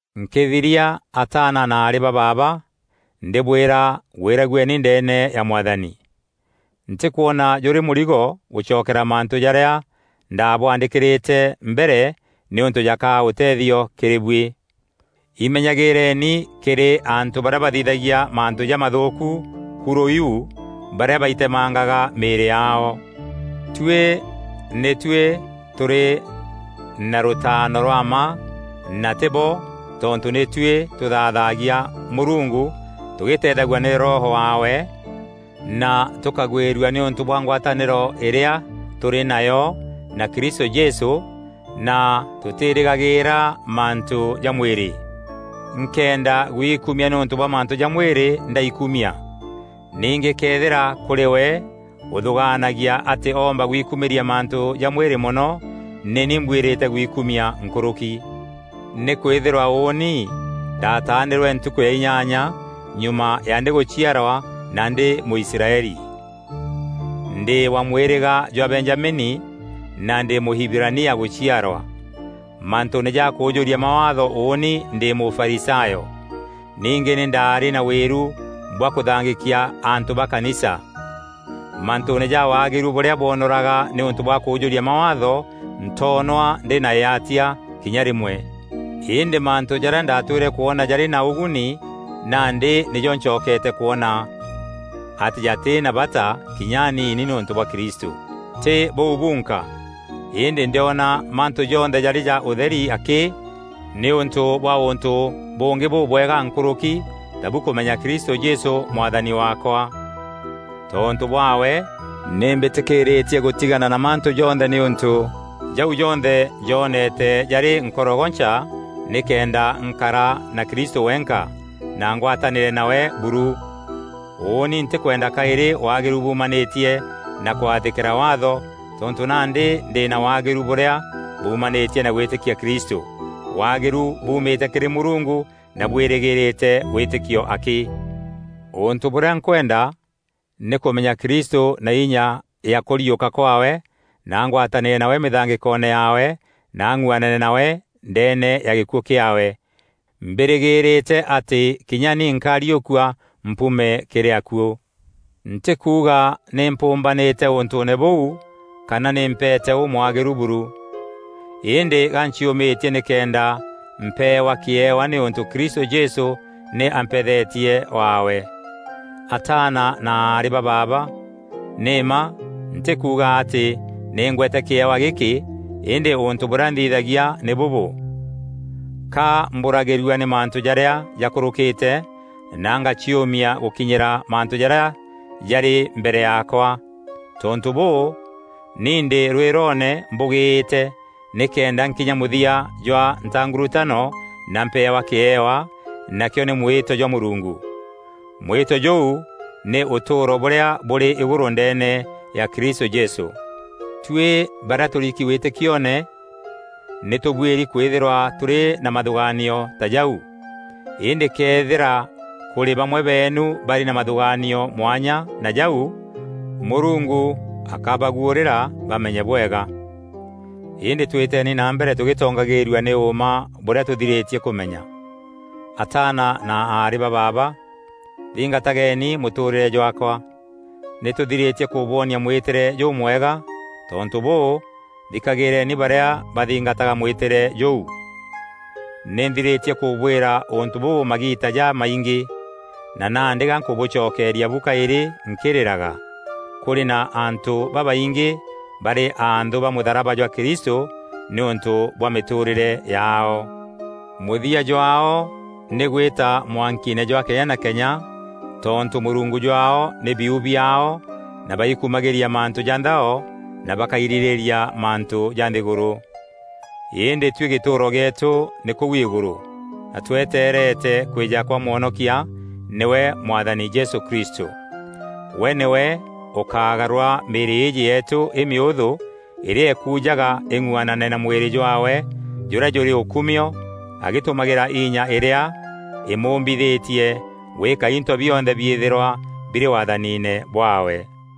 Nkîthiria ataana na aarî ba baaba, ndîbwîra gwîragueni ndeene ya Mwathani. Ntîkwona jûrî mûrigo gûcokera mantû jarîa ndabwaandîkîrîte mbere nîûntû jakaa ûtethio kîrî buî. Imenyagîîreni kîrî antû barîa bathithagia mantû jamathûûku, kurû iu, barîa baitemangaga mîîrî yaao. Tuî nî tuî tûrî na rûtaano rwa mma na tî bo, tontû nî tuî tûthaathagia Mûrungu tugîîteethagua nî Roho waawe na tûkagwîrua nîûntû bwa ngwatanîro îrîa tûrî nayo na Kristû Jesû na tûtîrîgagîîra mantû ja mwîrî. Nkenda guikumia nîûntû bwa mantû ja mwîrî, ndaikumia. Ningî këethîra kûrî we ûthûgaanagia atî oomba gwikumîria mantû ja mwîrî mono, nî ni mbwîrîte gwikumia nkûrûki. Nîkwîthîrwa ûûni ndataanîrwe ntukû ya inyanya nyuma ya ndîgûciarwa na ndî Mûisraeli. Ndî wa mwîrîga jwa Benjamini na ndî Mûhibirania gûciarwa. Mantûûne ja kûûjûria Mawaatho ûûni ndî Mûfarisayo. Ningî nî ndaarî na wîru bwa kûthangîkia antû ba kanisa. Mantûûne ja waagîru bûrîa bwonoraga nîûntû bwa kûûjûria Mawaatho, ntoonwa ndî na îatia kinya rîmwe. Îndî mantû jarîa ndatwîre kwona jarî na ûguni, nandî nîjo ncokeete kwona atî jatî na bata kinya aniini nîûntû bwa Kristû. Tî bûu bunka; îndî ndîona mantû jonthe jarî ja ûtheri akî nîûntû bwa ûntû bûngî bûbwega nkûrûki tabu kûmenya Kristû Jesû Mwathani waakwa. Tontû bwaawe nî mbîtîkîîrîtie gûtigana na mantû jonthe nîûntû jau jonthe njoonete jarî nkorogoncha nîkenda nkara na Kristû wenka na ngwatanîre nawe buru. Ûûni ntîkwenda kaîrî waagîru buumanîtie na kwathîkîra Waatho tontû nandî ndî na waagîru bûrîa bûûmanîtie na gwîtîkia Kristû; waagîru buumîte kîrî Mûrungu na bwîrîgîrîte wîtîkio akî. Ûntû bûrîa nkwenda, nî kûmenya Kristû na inya ya kûriûka kwaawe na ngwatanîre nawe mîthangîkoone yaawe na ng'uanane nawe ndeene ya gîkuû kîaawe, mbîrîgîîrîte atî kinya ni nkariûkua mpuume kîrî akuû. Ntîkuuga nî mpûûmbanîte ûntûûne bûu, kana nî mpeete ûmwagîru buru. Îndî ganciûmîtie nîkenda mpeewa kîewa nîûntû Kristû Jesû nî ampethetie waawe. Ataana na aarî ba baaba, nî mma ntîkuuga atî nî ngweete kîewa gîkî îndî ûntû bûrîa nthithagia nî bûbû: ka mbûragîrua nî mantû jarîa jakûrûkîte na ngaciûmia gûkinyîra mantû jarîa jarî mbere yaakwa. Tontû bûû, ni ndî rwîroone mbûgîîte nîkenda nkinya mûthia jwa ntangurutano na mpeewa kîewa, nakîo nî mwîto jwa Mûrungu. Mwîto jûu nî ûtûûro bûrîa bûrî îgûrû ndeene ya Kristû Jesû. Tuî barîa tûriki wîtîkioone nî tûbuîri kwîthîrwa tûrî na mathûgaanio ta jau. Îndî këethîra kûrî bamwe beenu barî na mathûgaanio mwanya na jau, Mûrungu akabûguûrîra bamenye bwega. Îndî twîteni na mbere tûgîtongagîîrua nî ûûma bûrîa tûthîrîtie kûmenya. Ataana na aarî ba baaba, thingatageni mûtûûrîre jwaakwa. Nî tûthirîtie kûbwonia mwîtîre jûmwega, tontû bûû, thikagîîreni barîa bathingataga mwîtîre jûu. Nî nthirîtie kûbwîra ûntû bûbû magiita jamaingî, na nandî ga nkûbûcokeeria bu kaîrî nkîrîraga: kûrî na antû babaingî barî anthû ba mûtharaba jwa Kristû nîûntû bwa mîtûrîre yaao. Mûthia jwaao nî gwîta mwankiine jwa kenya na kenya tontû mûrungu jwaao nî biu biaao na baikumagîria mantû ja nthao na bakairîrîîria mantû ja nthîgûrû. Îndî tuî gîtûûro gîetû nî kûu îgûrû, na tweteerete kwîja kwa Mwonokia, nîwe Mwathani Jesû Kristû. We nîwe ûkagarûra mîîrî îîjî yeetû îmîûthû îrîa îkuujaga îng'uanane na mwîrî jwaawe jûrîa jûrî ûkumio agîtûmagîra inya îrîa îmûmbithîtie gwîka into bionthe biîthîrwa birî waathaniine bwaawe.